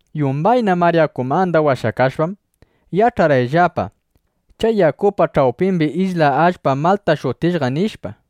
Yumbayna mar yakumanda washakashpam, yach'arqayllapa: Chay yakupa ch'awpimbi isla allpa Malta shutishqa, nishpa.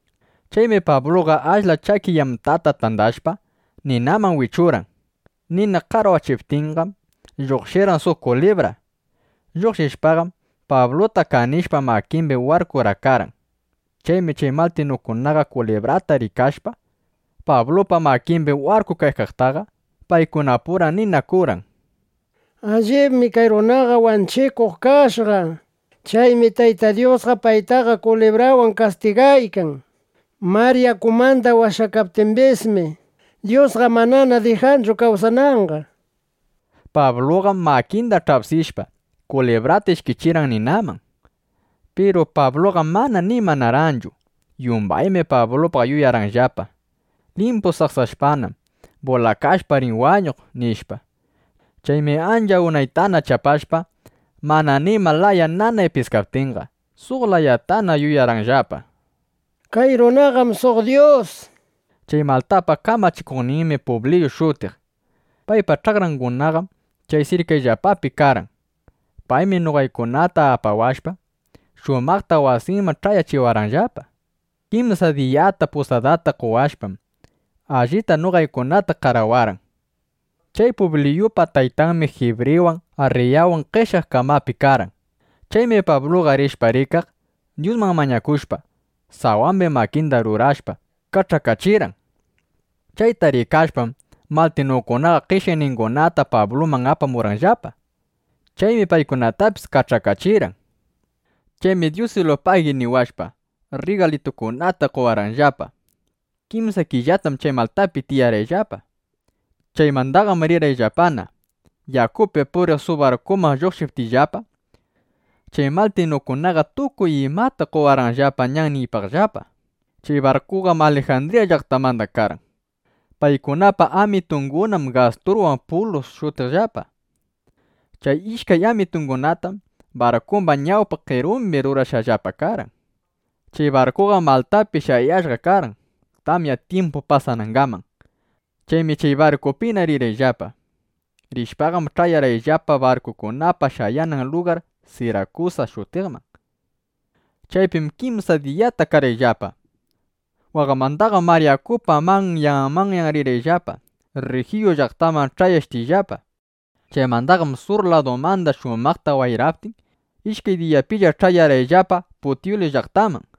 Chaymi Pabluqa ashla chaki yamtata tandashpa, ninaman wichurqan. Nina qarwachiptinqam, lluqshirqan suq kulibra. Lluqshishpaqam, Pabluta kanishpa makimbi warkurakarqan. Chaymi chay maltinukunaqa kulibrata rikashpa Pablupa makimbi warkukaqtaqa, paykunapura ninakurqan: —Allibmi kay runaqa wanchikuq kashqa. Chaymi Tayta Dyusqa paytaqa kulibrawan kastigaykan. Mar yakumanda washakaptimbismi, Dyusqa manana dijanchu kawsananqa, nishpa. Pabluqam makinda ch'apsishpa, kulibrata ishkichirqan ninaman. Piru Pabluqam mana nimanarqanchu. Yumbaymi Pablupaq yuyarqanllapa: Limpu saksashpanam, bulakashpa, rin wañuq, nishpa. Chaymi ancha unaytana chapashpa, mana nima laya nanay piskaptinqa, suq layatana yuyarqanllapa: Kay runaqam suq dyus, nishpa. Chay Maltapa kamachikuqninmi Publiyu shutiq. Paypa ch'akrangunam chay sirkayllapapi karqan. Paymi noqaykunata apawashpa, shumaqta wasinman ch'ayachiwarqanllapa. Kimsa diyata pusadata qowashpam, allita noqaykunata qarawarqan. Chay Publiyupa taytanmi jibriwan, arriyawan, qeshyaq kamapi karqan. Chaymi Pabluqa rishpa rikaq, Dyusman mañakushpa, sawambi makinda rurashpa, kach'akachirqan. Chayta rikashpam, maltinukunaqa qeshyaqningunata Pabluman apamurqanllapa. Chaymi paykunatapis kach'akachirqan. Chaymi “Dyusilupagi” niwashpa, rrigalitukunata qowarqanllapa. Kimsa killatam chay Maltapi tiyarqayllapa. Chaymandaqam rinaypaqllapana, yakupi puriq suq barkuman lluqshiptiyllapa, chay maltinukunaqa tukuy imata qowarqanllapa ñanniypaqllapa. Chay barkuqam Alijandriya llaqtamanda karqan. Paykunapa amitungunam Gasturwan Pulus shutiqllapa. Chay ishkay amitungunatam barkumba ñawpa qerumbi rurashqallapa karqan. Chay barkuqam Maltapi shayashqa karqan, tamya tyimpu pasanangaman. Chaymi chay barkupina rirqayllapa. Rishpaqam ch'ayarqayllapa barkukunapa shayanan lugar Sirakusa shutiqman. Chaypim kimsa diyata karqayllapa. Waqmandaqam mar yakupa manyan manyan rirqayllapa Rrijiyu llaqtaman ch'ayashtiyllapa. Chaymandaqam sur ladumanda shumaqta wayraptin, ishkay diyapilla ch'ayarqayllapa Putyuli llaqtaman.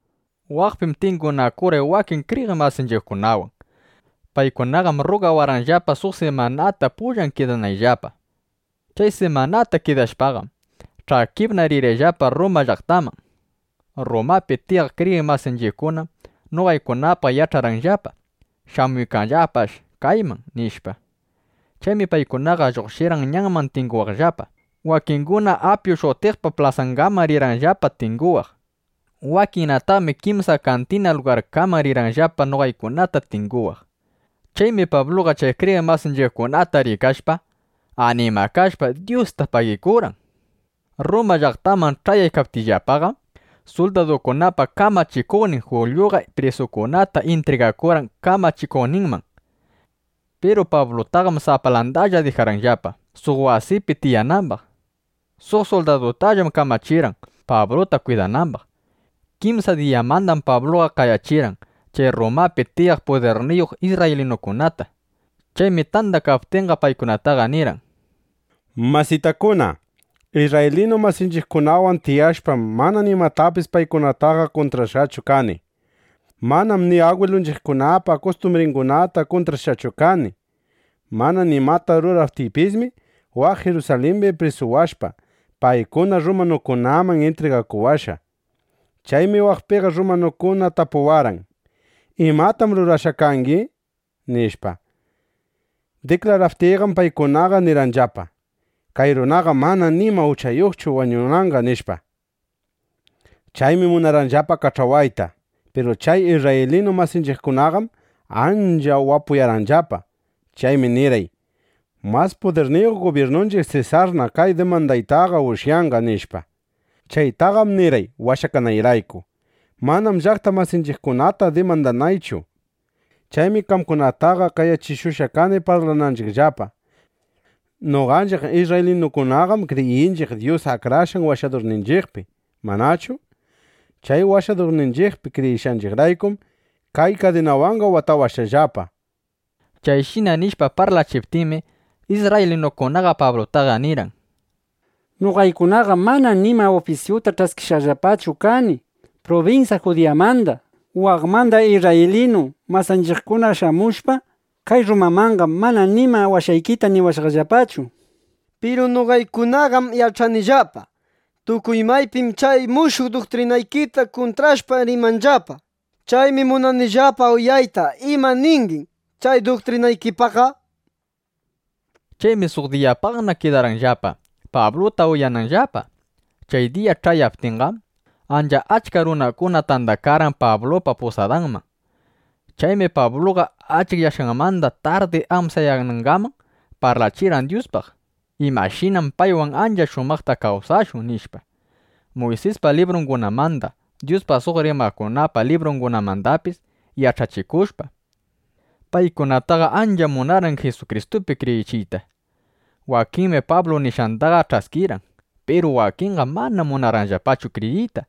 Waqpim tingunakurqay wakin kriyiq masinchiqkunawan. Paykunaqam rrugawarqanllapa, suq simanata pullan kidanayllapa. Chay simanata kidashpaqam, ch'akipna rirqayllapa Rruma llaqtaman. Rrumapi tiyaq kriyiq masinchiqkunam noqaykunapaq yach'arqanllapa: Shamuykanllapash kayman, nishpa. Chaymi paykunaqa lluqshirqan ñanman tinguwaqllapa; wakinguna Apyu shutiqpa plasangaman rirqanllapa tinguwaq. Wakinnataqmi Kimsa Kantina lugarkaman rirqanllapa, noqaykunata tinguwaq. Chaymi Pabluqa chay kriyiq masinchiqkunata rikashpa, animakashpa, Dyusta pagikurqan. Rruma llaqtaman ch'ayaptiyllapaqam, suldadukunapa kamachikuqnin Julyuqa prisukunata intrigakurqan kamachikuqninman. Piru Pablutaqam sapalandalla dijarqanllapa, suq wasipi tiyanambaq. Suq suldadutallam kamachirqanllapa, Pabluta kwidanambaq. Kimsa diyamandam Pabluqa qayachirqan chay Rrumapi tiyaq pudirniyuq isrraylinukunata. Chaymi tandakaptinqa, paykunataqa nirqan: —Masitakuna, isrraylinu masinchiqkunawan tiyashpam, mana nimatapis paykunataqa kuntrashqachu kani. Manam ni agwilunchiqkunapa kustumbringunata kuntrashqachu kani. Mana nimata ruraptiypismi, waq Jirusalimbi prisuwashpa, paykuna rrumanukunaman intrigakuwashqa. Chaymi waqpiqa rrumanukuna tapuwarqan: “¿Imatam rurashqa kangi?” nishpa. Diklaraptiyqam paykunaqa nirqanllapa: “Kay runaqam mana nima uchayuqchu wañunanqa”, nishpa. Chaymi munarqanllapa kach'awayta. Piru chay isrraylinu masinchiqkunaqam ancha wapuyarqanllapa. Chaymi nirqay: “Mas pudirniyuq gubyirnunchiq Sesarna kay dimandaytaqa ushyanqa”, nishpa. Chaytaqam nirqay washakanayrayku; manam llaqta masinchiqkunata dimandanaychu. Chaymi qamkunataqa qayachishushqa kani parlananchiqllapa. Noqanchiq isrraylinukunaqam kriyinchiq Dyus Akrashqan Washadurninchiqpi, ¿manachu? Chay Washadurninchiqpi kriyishqayraykum, kay kadinawanqa watawashqallapa. Chayshina nishpa parlachiptinmi, isrraylinukunaqa Pablutaqa nirqan: —Noqaykunaqam mana nima ufisyuta ch'askishqallapachu kani prubinsya Judiyamanda. Waqmanda isrraylinu masinchiqkuna shamushpa kay Rrumamanqam, mana nima washaykita niwashqallapachu. Piru noqaykunaqam yach'anillapa: Tukuy maypim chay mushuq duktrinaykita kuntrashpa, rimanllapa. Chaymi munanillapa uyayta ima ningim chay duktrinaykipaqqa, nishpa. Chaymi suq diyapaqna kidarqanllapa, Pabluta uyananllapa. Chay diya ch'ayaptinqam, ancha achka runakuna tandakarqan Pablupa pusadanman. Chaymi Pabluqa achikyashqanmanda tardi amsayanangaman parlachirqan Dyuspaq, imashinam paywan ancha shumaqta kawsashun, nishpa. Muysispa librungunamanda, Dyuspaq suq rimaqkunapa librungunamandapis yach'achikushpam, paykunataqa ancha munarqan Jisukristupi kriyichiyta. Wakinmi Pablu nishqandaqa ch'askirqan. Piru wakinqam mana munarqanllapachu kriyiyta.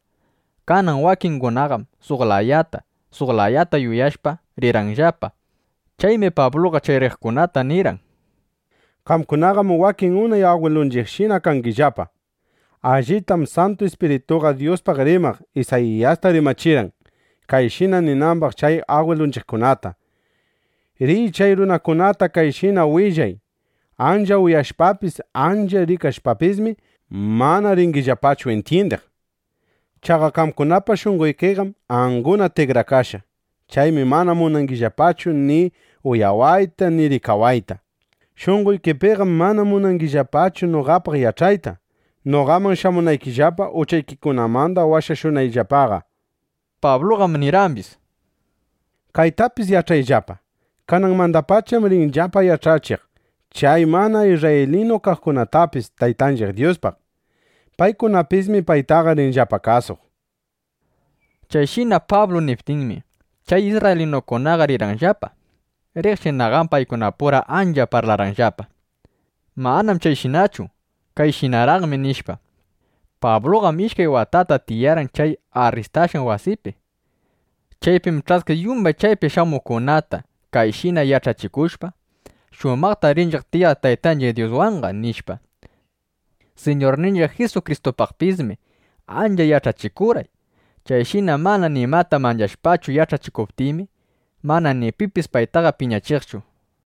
Kanan wakingunaqam suq layata, suq layata yuyashpa, rirqanllapa. Chaymi Pabluqa chay riqkunata nirqan: —(Qamkunaqam wakin unay agwilunchiqshina kangillapa.) Allitam Santu Ispirituqa Dyuspaq rimaq Isayiyasta rimachirqan, kayshina ninambaq chay agwilunchiqkunata: Riy chay runakunata kayshina willay: Ancha uyashpapis, ancha rikashpapismi, mana ringillapachu intyindiq. Chaqa qamkunapa shunqoykiqam anguna tikrakashqa. Chaymi mana munangillapachu ni uyawayta ni rikawayta. Shunqoykipiqam mana munangillapachu noqapaq yach'ayta, noqaman shamunaykillapa, uchaykikunamanda washashunayllapaqa, nishpa. Kaytapis yach'ayllapa: Kananmandapacham rinillapa yach'achiq chay mana isrraylinu kaqkunatapis Taytanchiq Dyuspaq. Paykunapismi paytaqa rinllapa kasuq. ˻ Chayshina Pablu niptinmi, chay isrraylinukunaqa rirqanllapa. Riqshinaqam paykunapura ancha parlarqanllapa: —Manam chayshinachu. Kayshinaraqmi, nishpa.˼ Pabluqam ishkay watata tiyarqan chay arrindashqan wasipi. Chaypim ch'askiq yumbay payman shamuqkunata, kayshina yach'achikushpa: —Shumaqtam rinchiq tiyaq Taytanchiq Dyuswanqa, nishpa. Siñurninchiq Jisukristupaqpismi ancha yach'achikurqan. Chayshina mana nimata manchashpachu yach'achikuptinmi, mana ni pipis paytaqa piñachiqchu. (Chaytallam iskibrirqan San Lukas.)